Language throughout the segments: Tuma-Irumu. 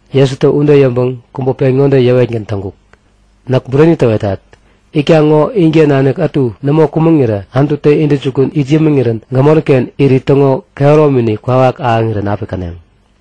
Jesutä ude yäŋpäŋ kubä pen ŋode yäwetgän täŋkuk; Näk bureni täwetat. Itkaŋ ŋo inken nanik ätu nämo kumäŋirä Anututä intäjukun it yämiŋirän gämoriken irit täŋo kehäromini kwawak ahäŋirän api käneŋ.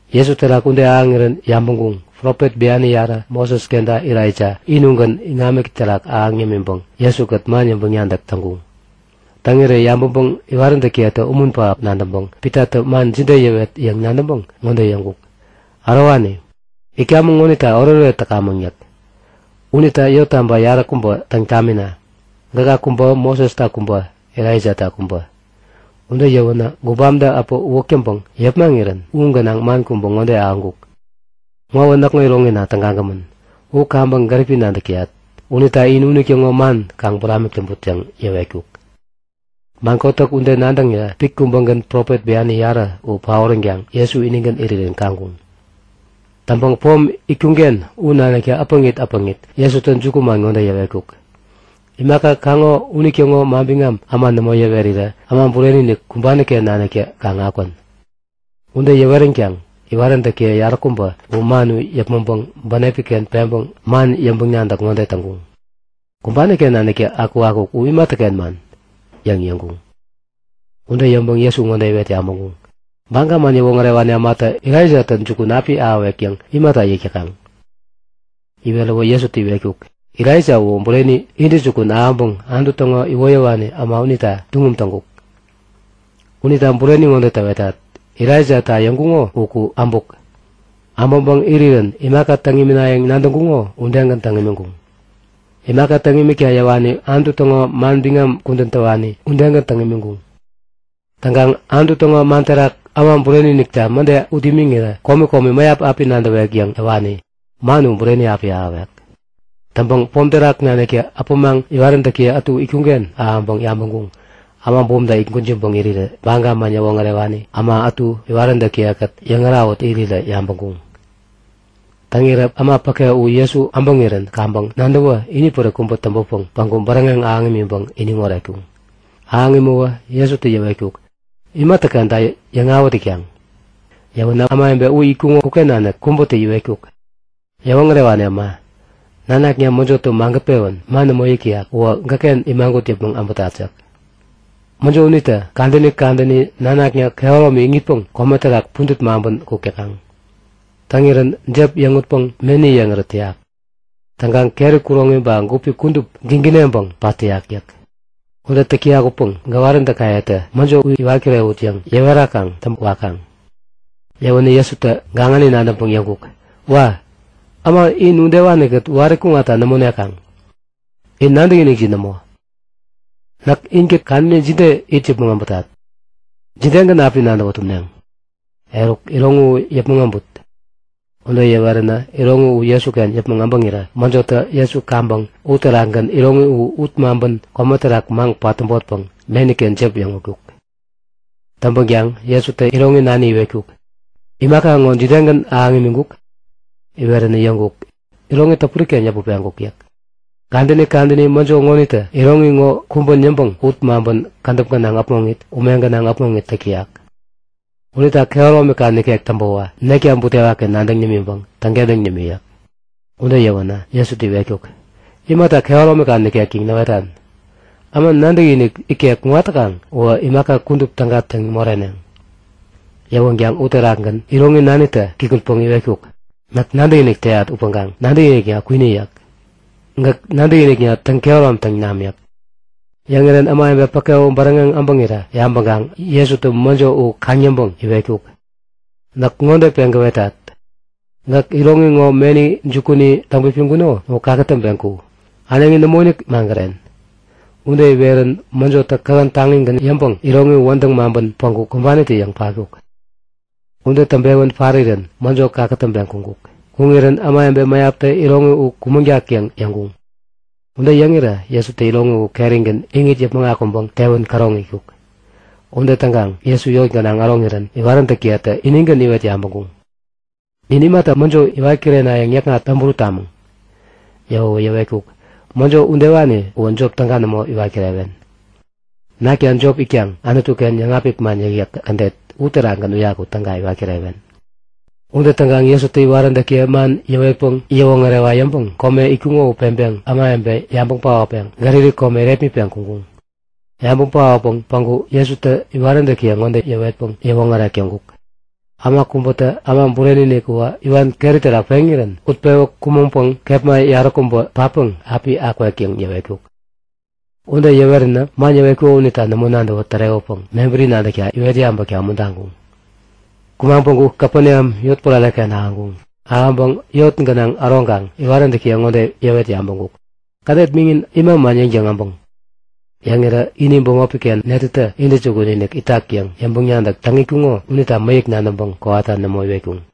Jesu terak ude ahäŋirän yabäŋkuŋ; Profet biani yarä Moses kenta Elaija ini ugän iŋami terak ahäŋ yämiŋpäŋ Jesu-kät man yäŋpäŋ-nadäk täŋkuŋ. Täŋirä yabäŋpäŋ iwaräntäkiyetä umun pähap nadäŋpäŋ Pitatä man jide yäwet yäŋ nadäŋpäŋ ŋode yäŋkuk; Ärowani, itkamäŋ ŋonita oretoret täkamäŋ yäk. Unita yottaba yaräkubä täŋ tamina. Gäka kubä, Mosesta kubä, Elaijata kubä yäk. Ude yäwänä gubamtä äpä uwäk täŋpäŋ yepmaŋirän u gänaŋ man kubä ŋode ahäŋkuk; Ŋowä näkŋo iroŋina tägagämän. U kaŋpäŋ gäripi nadäk täyat unita in unitäŋo man kaŋ buramik täŋput yäŋ yäwetkuk. Man kotäk ude nadäŋirä pit kubägän profet biani yarä u paoränkaŋ Jesu inigän irirän kaŋkuŋ. Täŋpäŋ pom itkuŋ-ken u naniktä äpäŋit äpäŋit Jesutä jukuman ŋode yäwetkuk; Imaka kaŋo unitäŋo manbiŋam äma nämo yäwerirä Äma Bureni-inik kumbani-ken naniktä kaŋ akwän. Ude yäweränkaŋ iwaräntäkiye yaräkubä u man u yäpmäŋpäŋ bänepi-ken peŋpäŋ man yäŋpäŋ-nadäk ŋode täŋkuŋ; Kumbani-ken naniktä akukakuk u imatäken man? yäŋ yäŋkuŋ. Ude yäŋpäŋ Jesu ŋode iwet yabäŋkuŋ; Baga man yäwoŋärewani ämatä Elaijatä jukun api ahäwek yäŋ imata yäk täkaŋ? Iweräwä Jesutä yäwetkuk; Elaija uwä bureni intäjukun ahäŋpäŋ Anutu täŋo iwoyäwani äma unita tuŋum täŋkuk. Unita bureni ŋode täwetat; Elaijata yäŋkuŋo uku äbuk. Äbäŋpäŋ irirän imaka täŋ iminayäŋ nadäŋkuŋo udegän täŋ imiŋkuŋ. Imaka täŋ imikta yäwani Anutu täŋo man bian kudän täwani udegän täŋ imiŋkuŋ. Täŋkaŋ Anutu täŋo man terak Äma Bureni-inikta mäde ut imiŋirä komi komi mäyap api nadäwek yäŋ yäwani, man u bureni api ahäwek. Täŋpäŋ pom terak naniktä äpämaŋ iwaräntäkiye ätu itkuŋ-ken ahäŋpäŋ yabäŋkuŋ; Äma bumta it gwäjiŋpäŋ irirä Baga man yäwoŋärewani äma ätu iwaräntäkiye-kät yäŋärahut irirä yabäŋkuŋ. Täŋirä äma päke u Jesu äbäŋirän kaŋpäŋ nadäwä inipärik kubä täŋpäpäŋ päŋku bäräŋeŋ ahäŋ imiŋpäŋ iniŋ oretkuŋ. Ahäŋ imäwä Jesutä yäwetkuk; Imatäkenta yäŋawät itkaŋ? Yäwänä ämawebe u itkuŋo uken nanik kubätä iwetkuk; Yäwoŋärewani äma, nanakna mäjotä magät-pewän man nämo yäk täyak uwä gäkken imagut yäpmäŋ äbätat yäk. Mäjo unitä kadäni kadäni nanakna kehäromi iŋitpäŋ kome terak pudät maŋpän kuk täkaŋ. Täŋirän jep yäŋutpäŋ meni yeŋärät täyak. Täŋkaŋ keri kuroŋi ba gupi kudup gigineŋpäŋ pat täyak yäk. Ude täk täyak upäŋ gäwaräntäkayetä mäjo u iwat kirewut yäŋ yäwerakaŋ täŋpä wakaŋ. Yäwänä Jesutä gaŋani nadäŋpäŋ yäŋkuk; Wa! Äma in udewani-kät wari kuŋatta nämo nekaŋ! In nadäkinikjin nämo! Näk inkät kadäni jide it yäpmäŋ äbätat? Jidegän api nadäwä tumneŋ? Eruk, iroŋi u yäpmäŋ äbut. Ude yäweränä iroŋi u Jesuken yäpmäŋ äbäŋirä mäjotä Jesu kaŋpäŋ u terakgän iroŋi u ut maŋpän kome terak maŋ-patäbotpäŋ meniken jep yäŋutkuk. Täŋpänkaŋ Jesutä iroŋi nani iwetkuk; Imaka ŋo jidegän ahäŋ imiŋkuk? Iweränä yäŋkuk; Iroŋi täpuri-ken yäput peŋkuk yäk. Kadäni kadäni mäjo ŋonitä iroŋi ŋo kumbän yäŋpäŋ ut maŋpän kädäp gänaŋ äpmoŋit ume gänaŋ äpmoŋit täk täyak. Unita kehäromika nikek täŋpäwä nekta butewaki nadäŋ nimiŋpäŋ täŋkentäŋ nimi yäk. Ude yäwänä Jesutä iwetkuk; Imata kehäromika nikek yäŋ näwetan? Äma nadäkinik ikek kuŋat täkaŋ uwä imaka kudup täga täŋ moreneŋ. Yäwänkaŋ uterakgän iroŋi nanitä kikŋutpäŋ iwetkuk; Näk nadäkinik täyat upäŋkaŋ nadäkinikna kwini yäk. Gäkä nadäkinikna täŋ-kehäromtaŋ nami. Yäŋirän ämawebe päke u bäräŋeŋ äbäŋirä yabäŋkaŋ Jesutä mäjo u kaŋ-yäŋpäŋ iwetkuk; Näk ŋode peŋ gäwetat; Gäk iroŋi ŋo meni jukuni täŋpipiŋkuno u kakätäŋpeŋ ku! Äneŋi nämoinik magären! Ude iwerirän mäjotä kähän taŋigän yäŋpäŋ iroŋi u wädäŋ maŋpän päŋku kumbanitä-yäŋ patkuk. Ude täŋpewän parirän mäjo kakätäŋpeŋ kuŋkuk. Kuŋirän ämawebe mäyaptä iroŋi u kumäŋtak yäŋ yäŋkuŋ. Ude yäŋirä Jesutä iroŋi u kerigän iŋit yäpmäŋ akuŋpäŋ tewän käroŋ itkuk. Ude täŋkaŋ Jesu yot gänaŋ äroŋirän iwaräntäkiyetä inigän iwet yabäŋkuŋ; Nin imata mäjo iwat kirenayäŋ yäkŋat täŋburut tamäŋ? Yäwäwä yäwetkuk; Mäjo udewani uwä jop täga nämo iwat kirewen. Nakta jop itkaŋ Anutu-ken yäŋapik man yäkyäk kädet uterakgän uyaku täga iwat kirewen. Ude täŋkaŋ Jesutä iwaräntäkiye man yäwetpäŋ yäwoŋärewa yäŋpäŋ kome itkuŋo u peŋpeŋ ämawebe yabäŋ paotpeŋ Galili kome irepmitpeŋ kuŋkuŋ. Yabäŋ paotpeŋ päŋku Jesutä iwaräntäkiye ŋode yäwetpäŋ yäwoŋärek täŋkuk; Äma kubätä Äma Bureni-inik uwä iwan keri terak peŋirän utpewä kumäŋpäŋ kepma yaräkubä patpäŋ api akwek yäŋ yäwetkuk. Ude yäweränä man yäwetkuko unita nämo nadäwä tärewäpäŋ mebäri nadäkta iwet yabäkta umuntaŋkuŋ. Kumaŋ päŋku Kapeneam yotpärare-ken ahäŋkuŋ. Ahäŋpäŋ yot gänaŋ äroŋkaŋ iwaräntäkiye ŋode yäwet yabäŋkuk; Kädet miŋin ima man yäŋtäŋ abäŋ? Yäŋirän ini bämopi-ken netätä intäjukun-inik itak yäŋ yäŋpäŋ-nadäk täŋ itkuŋo unita mäyäk nadäŋpäŋ kowata nämo iwetkuŋ.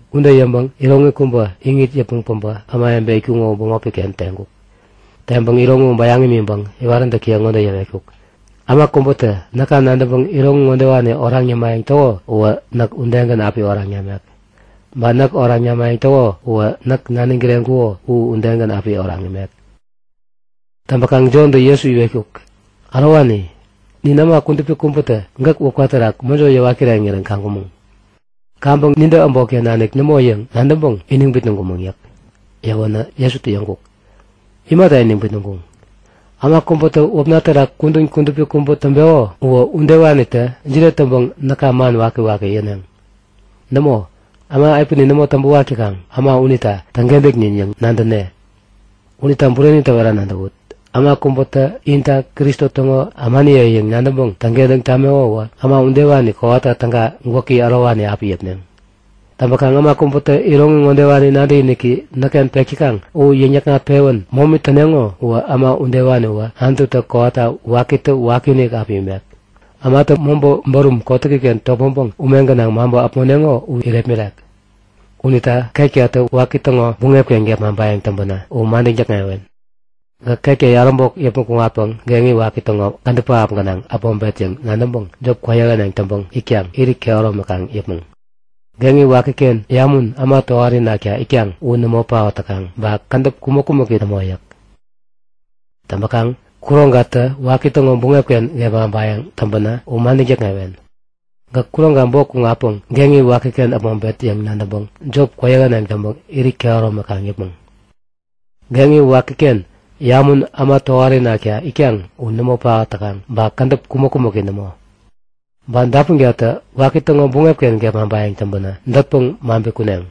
Ude yäŋpäŋ iroŋi kubä iŋit yäpmäŋ päbä ämawebe itkuŋo u bämopi-ken teŋkuk. Teŋpäŋ iroŋi u bäyaŋ imiŋpäŋ iwaräntäkiye ŋode yäwetkuk; Äma kubätä näka nadäŋpäŋ iroŋi ŋodewani oraŋ yämayäŋ täko uwä näk udegän api oraŋ namek. Ba näk oraŋ namayäŋ täko uwä näk naniŋ kireŋkuko u udegän api oraŋ imek. Täŋpäkaŋ Jontä Jesu iwetkuk; Ärowani, nin äma kudupi kubätä gäk wäpka terak mäjo yäwat kireŋirän kaŋkumäŋ. Kaŋpäŋ nintä äbotken nanik nämo yäŋ nadäŋpäŋ iniŋ bitnäŋkumäŋ yäk. Yäwänä Jesutä yäŋkuk; Imata iniŋ bitnäŋkuŋ? Äma kubätä wäpna terak kudän kudupi kubä täŋpeko uwä udewanitä jide täŋpäŋ näka man wakiwaki yäneŋ? Nämo, äma epänin nämo täŋpäwak täkaŋ äma unita täŋkentäknin yäŋ nadäne. Unita bureni täwera nadäwut; Äma kubätä inta Kristo täŋo ämaniye yäŋ nadäŋpäŋ täŋkentäŋ tameko uwä äma udewani kowata täga gwäki ärowani api yäpneŋ. Täŋpäkaŋ äma kubätä iroŋi ŋodewani nadäkiniki näkken pek täkaŋ u yäŋ-yäkŋat-pewän momi täneŋo uwä äma udewaniwä Anututä kowata wakitä wakiinik api imek, ämatä mobä bärum kotäkiken topmäŋpäŋ ume gänaŋ maŋpä äpmoneŋo u irepmirek. Unita ketkatä waki täŋo buŋep-ken gepmaŋpayäŋ täŋpänä u madäŋ täkŋewen. Gäk ketka yaräbok yäpmäŋ kuŋatpäŋ geŋi waki täŋo kädäp pähap gänaŋ äpmoŋpet yäŋ nadäŋpäŋ jop kwäyähäneŋ täŋpäŋ itkaŋ irit kehäromi kaŋ yäpmäŋ. [ Geŋi wakiken yamun äma tohari nakta itkaŋ u nämo paot täkaŋ ba kädäp kumäk-kumäki nämo yäk.] Täŋpäŋ kuroŋkatä waki täŋo buŋep-ken gepmaŋpayäŋ täŋpänä u madäŋ täkŋewen. Gäk kuroŋka bok kuŋatpäŋ geŋi wakiken äpmoŋpet yäŋ nadäŋpäŋ jop kwäyähäneŋ täŋpäŋ irit kehäromi kaŋ yäpmäŋ. [ Geŋi wakiken yamun äma tohari nakta itkaŋ u nämo paot täkaŋ ba kädäp kumäk-kumäki nämo.] Ba dapunkatä waki täŋo buŋep-ken gepmaŋpayäŋ täŋpänä dätpäŋ maŋpi kuneŋ.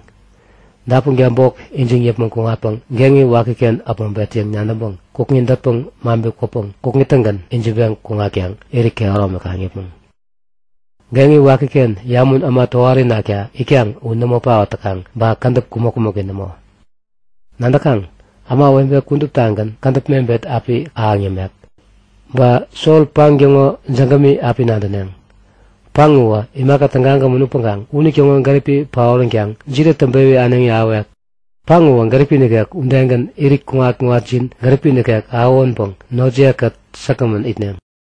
Dapunka bok ijiŋ yäpmäŋ kuŋatpäŋ geŋi wakiken äpmoŋpet yäŋ nadäŋpäŋ kukŋi dätpäŋ maŋpi kwäpäŋ kukŋi-tägän ijiŋpeŋ kuŋatkaŋ irit kehäromi kaŋ yäpmäŋ. Geŋi wakiken yamun äma tohari nakta itkaŋ u nämo paot täkaŋ ba kädäp kumäk-kumäki nämo. Nadäkaŋ? Ämawebe kuduptagän kädäp mebet api ahäŋ yämek. Ba sol-paŋ täŋo jägämi api nadäneŋ. Paŋ uwä imaka tägagämän upäŋkaŋ unitäŋo gäripi paoränkaŋ jide täŋpewi äneŋi ahäwek? Paŋ uwä gäripi nikek udegän irit kuŋat-kuŋatjin gäripi nikek ahäwänpäŋ notjiye-kät säkgämän itneŋ.